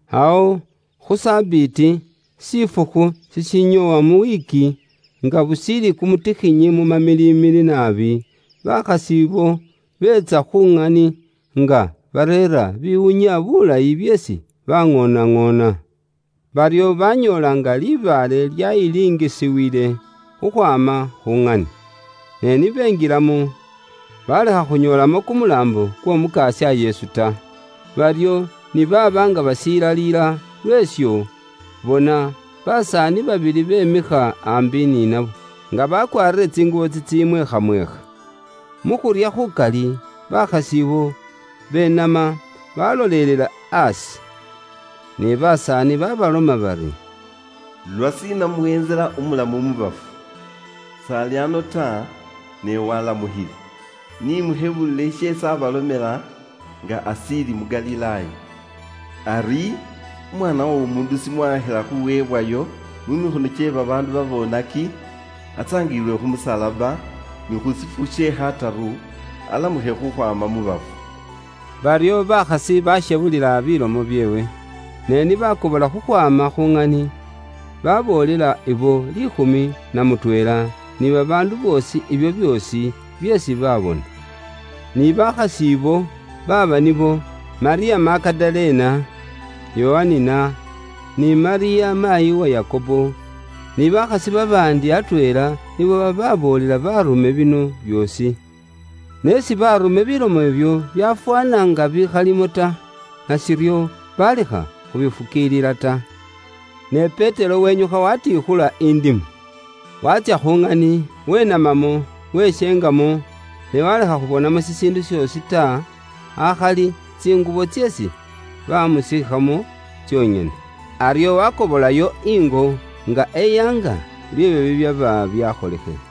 Awo khu Sabiti, shifukhu shishinyoowa mu wiiki, nga bushiili kumutikhinyi mu mamilimili naabi, bakhasi ibo beetsa khu ŋani nga bareera bibiwunya bulayi byeesi baaŋoonaŋoona. Baryo banyoola nga libaale lyayilingisiwile khukhwaama khu ŋani. Ne ni benjilamo, balekha khunyoolamo kumulaambo kw'Omukasya Yesu ta. Baryo ni baaba nga bashilaliila lweesho, bona, basaani babili bemikha aambi ni nabo, nga bakwaarire tsingubo tsitsimwekhamwekha. Mu khurya khukali, bakhasi abo benama, baalolelela aasi. Ne basaani baabaloma bari: “Lwashiina muweentsela umulamu mu bafu? S'ali ano ta, ne waalamukhile. Ni mukhebulile sheesi aabaalomela nga ashiili mu Galilaaya ari, ‘Umwaana w'Omuundu shimwaakhila khuweebwayo mu mikhono kye babaandu baboonaki, atsaangililwe khu musalaba, ni khu shifukhu she khataru alamukhe khukhwaama mu bafu.’” Baryo bakhasi baashebulila bilomo byeewe. Ne ni baakobola khukhwaama khu ŋani, baboolela ibo liikhumi na mutweela ni babaandu boosi ibyo byoosi byeesi baabona. Ni bakhasi ibo baaba nibo Malyamu Magadalena, Yohanina, ni Malyamu maayi wa Yakobo, ni bakhasi babaandi atweela, nibo bababoolela baarume bino byoosi. Ne isi baarume bilomo ibyo byafwaana nga bikhalimo ta, nashiryo balekha khubifukiilila ta. Ne Petero wenyukha watiikhula indimo, waatsya khu ŋani, wenamamwo, weshengamwo ne walekha khubonamwo shishiindu shoosi ta, akhali tsingubo tseesi bamusiikhamo tsonyene. Aryo wakobolayo ingo, nga eyaanga, lweebyo bibyaba byakholekhile.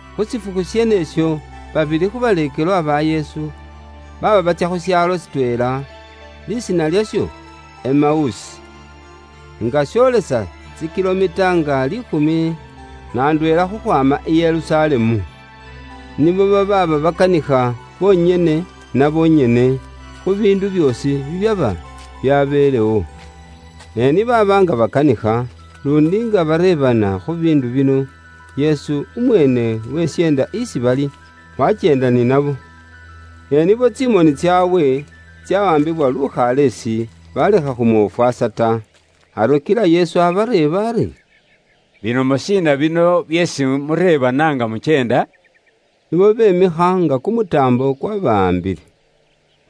Khu shifukhu sheenesho, babili khu baleekelwa ba Yesu baaba batsya khu shaalo shitweela, lisiina lyasho Emausi; nga shoolesa tsi kilomita nga liikhumi na ndweela khukhwaama i Yerusalemu. Nibo baaba bakanikha bonyene na bonyene khu biindu byoosi bibyaba byabelewo. Ne ni baaba nga bakanikha, luundi nga bareebana khu biindu bino, Yesu umweene wesyeenda isi bali, wakyeenda ni nabo. Ne nibo tsimoni tsaabwe tsawaambiwa lukhaleesi, balekha khumwofwaasa ta. Aryo kila Yesu abareeba ari, “Bilomo shiina bino byeesi mureebana nga mukyenda?” Nibo bemikha nga kumutaambo kwabawaambile.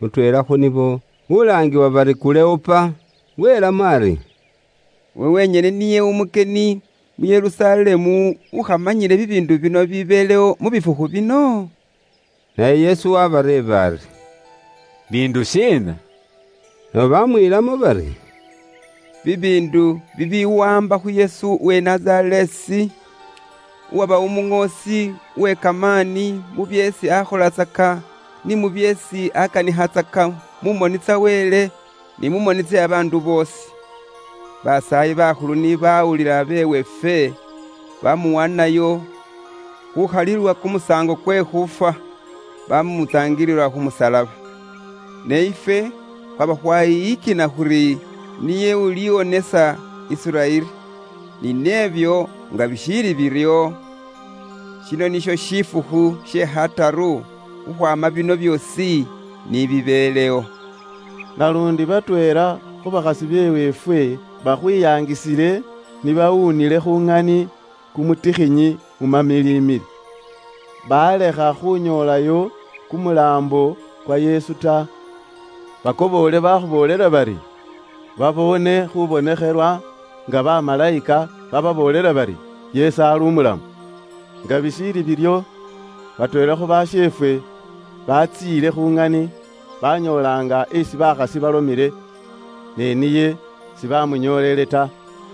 Mutweela khu nibo ulaangiwa bari Kuleopa, welamo ari, “Iwe wenyene niye umukyeni mu Yerusalemu ukhamanyile bibiindu bino bibibeelewo mu bifukhu bino?” Naye Yesu waabareeba ari, “Bindu shiina?” Nabo baamwiilamo bari, “Bibiindu bibiwaamba khu Yesu uwe Nazareesi, uwaba Umuŋoosi uwe kamaani mu byeesi akholatsaka ni byeesi akanikhatsaka mu moni tsa Wele, ni mu moni tse babaandu boosi. Basaayi bakhulu ni bawuli be weefwe bamuwaanayo khukhalilwa kumusaango kwe khuufwa, bamutsaangilila khu musalaba. Ne ifwe khwaba khwayiyikina khuri niye uliwonesa Isiraeli. Ni nebyo nga bishiili biryo, shino nisho shifukhu she khataru khukhwaama bino byoosi ni bibeelewo. Naluundi batweela khu bakhasi be weefwe bakhwiyaangisile, ni bawuunile khu ŋani kumutikhinyi mu mamilimili, balekha khunyoolayo kumulaambo kwa Yesu ta. Bakoboole bakhuboolela bari, baboone khubonekhelwa nga bamalayika bababoolela bari, Yesu ali umulamu. Nga bishiili biryo, batweela khu basheefwe batsiile khu ŋani banyoola nga esi bakhasi balomele, ne niye sibamunyoolele ta.”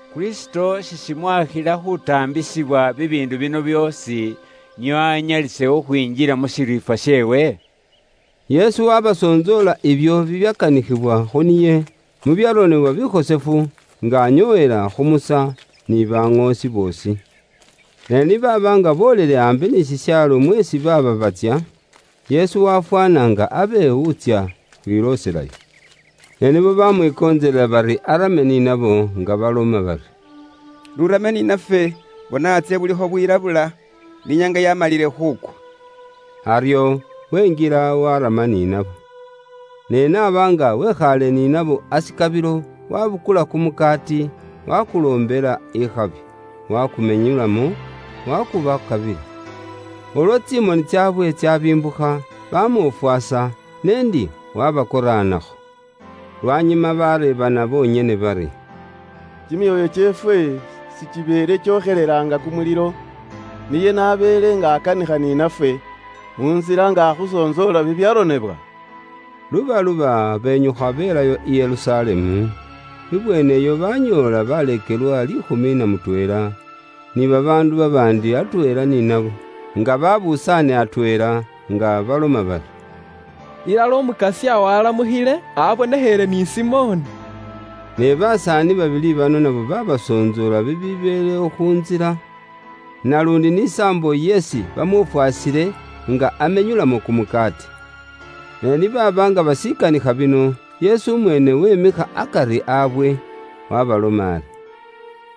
Kristo sishimwakhila khutaambisibwa bibiindu bino byoosi, nio anyalise khukhwinjila mu shiriifwa sheewe?” Yesu wabasontsoola ibyo bibyakanikhibwa khu niye mu byaronebwa bikhosefu, nga anyoowela khu Musa, ni baŋoosi boosi. Ni baaba nga boolele aambi ni shishaalo mweesi baaba batsya, Yesu wafwaana nga abe wuutsya khwilooselayo. Ne nibo bamwikontselela bari arame ni nabo nga baloma bari, “N'urame ni nafwe, bona antsye bulikho bwilabula, ni inyaanga yamalile khuukwa.” Aryo wenjila, warama ni nabo. Ne n'aba nga wekhaale ni nabo ashikabilo, wabukula kumukaati, wakuloombela ikhabi, wakumenyulamo, wakubakabila. Ulwo tsimoni tsaabwe tsabimbukha, bamwofwasa, n'endi wabakoraanakho. Lwanyuma bareebana bonyene bari, “Kimyoyo kyeefwe sikibeele kyokhelela nga kumulilo, niye n'abeele nga akhukanikhayo khu ntsila, nga akhusontsoola ifwe bibyaronebwa bikhosefu?” Lubaluba benyukha belayo i Yerusalemu, ibweeneyo banyoola baleekelwa liikhumi na mutweela, ni babaandu babaandi atweela ni nabo, nga babusaane atweela, nga baloma bari, “Ilala Umukasya waalamukhile, abonekheele ni Simoni!” Ne basaani babili bano nabo baabasontsoola bibibeelewo khu ntsila, naluundi ni saambo isi bamwofwaasile nga amenyulamo kumukaati. Ne ni baaba nga bashikanikha bino, Yesu umweene wemikha akari waabwe, waabaloma ari,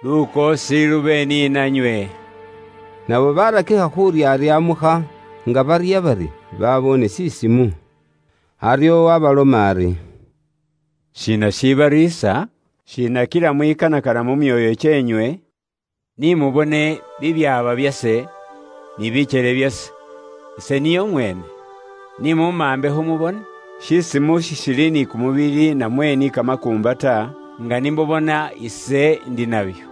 “Lukoosi lube ni nanywe.” Nabo barakikha khuryaryamukha, nga barya bari baboone shisimu. Aryo waabaloma ari, “Shiina shibariisa? Shiina kila mwikanakana mu myoyo kyeenywe? Ni mubone bibyaaba byase, ni bikyele byase, ise niye Umweene. Ni mumambekho mubone. Shisimu sishili ni kumubili namwe ni kamakuumba ta, nga ni mubona ise ndi nabyo.”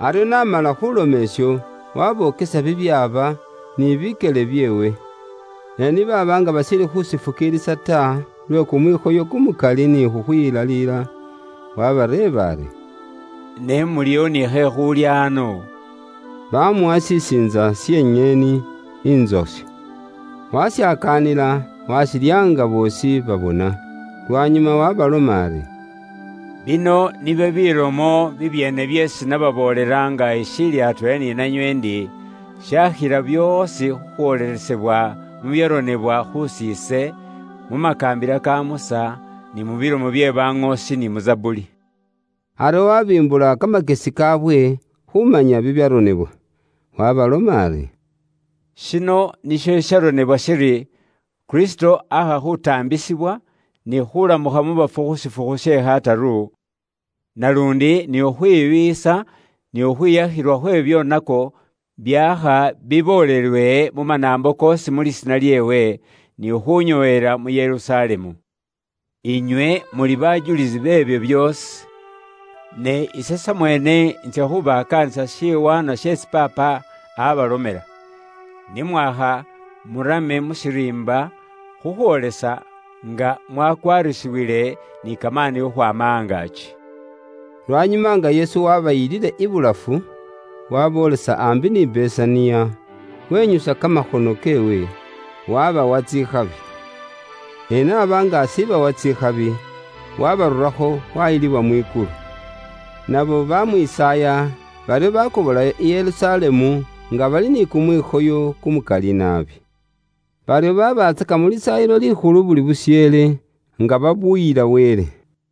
Aryo n'amala khuloma isho, wabokesa bibyaaba ni bikyele byeewe. Ne ni baaba nga bashiili khushifukiilisa ta lwe kumwikhoyo kumukali ni khukhwilaliila, wabareeba ari, “Ne muliwo ni khekhuulya ano?” Bamuwa shisiintsa she nyeeni intsoshe. Washakaanila, washilya nga boosi babona. Lwanyuma waabaloma ari, “Bino nibyo bilomo bibyeene byeesi nababoolela nga ishiili atweela ni nanywe ndi, shaakhila byoosi khukhwoolelesebwa mu byaronebwa khusiise; mu makaambila ka Musa, ni mu bilomo bye baŋoosi ni mu Zabuli.” Aryo wabimbula kamakyesi kaawe khumanya bibyaronebwa bikhosefu; waabaloma ari, “Shino nisho shisharonebwa shiri: Kristo aakha khuutaambisibwa, ni khuulamukha mu bafu khu shifukhu she khataru, naluundi ni khukhwibiiyisa ni khukhwiyakhilwa khwe bibyoonako byaakha biboolelwe mu manaambo koosi mu lisiina lyeewe, ni khunyoowela mu Yerusalemu. Inywe muli bajulisi beebyo byoosi. Ne ise samweene intsya khubakaanisa shiwaanwa sheesi Paapa abalomela. Ne mwakha murame mu shiriimba khukhwoolesa nga mwakwaarisiwile ni kamaani khukhwaama angaaki.” Lwanyuma nga Yesu wabayilile ibulafu, waboolesa aambi ni Besaniya, wenyusa kamakhono keewe, wabawa tsikhabi. Ne n'aba nga ashibawa tsikhabi, wabarurakho wayilibwa mwikulu. Nabo bamwisaaya, baryo bakobolayo i Yerusalemu nga bali ni kumwikhoyo kumukali naabi. Baryo baabatsaka mu Lisaayilo Likhulu buli busheele, nga babuyila Wele.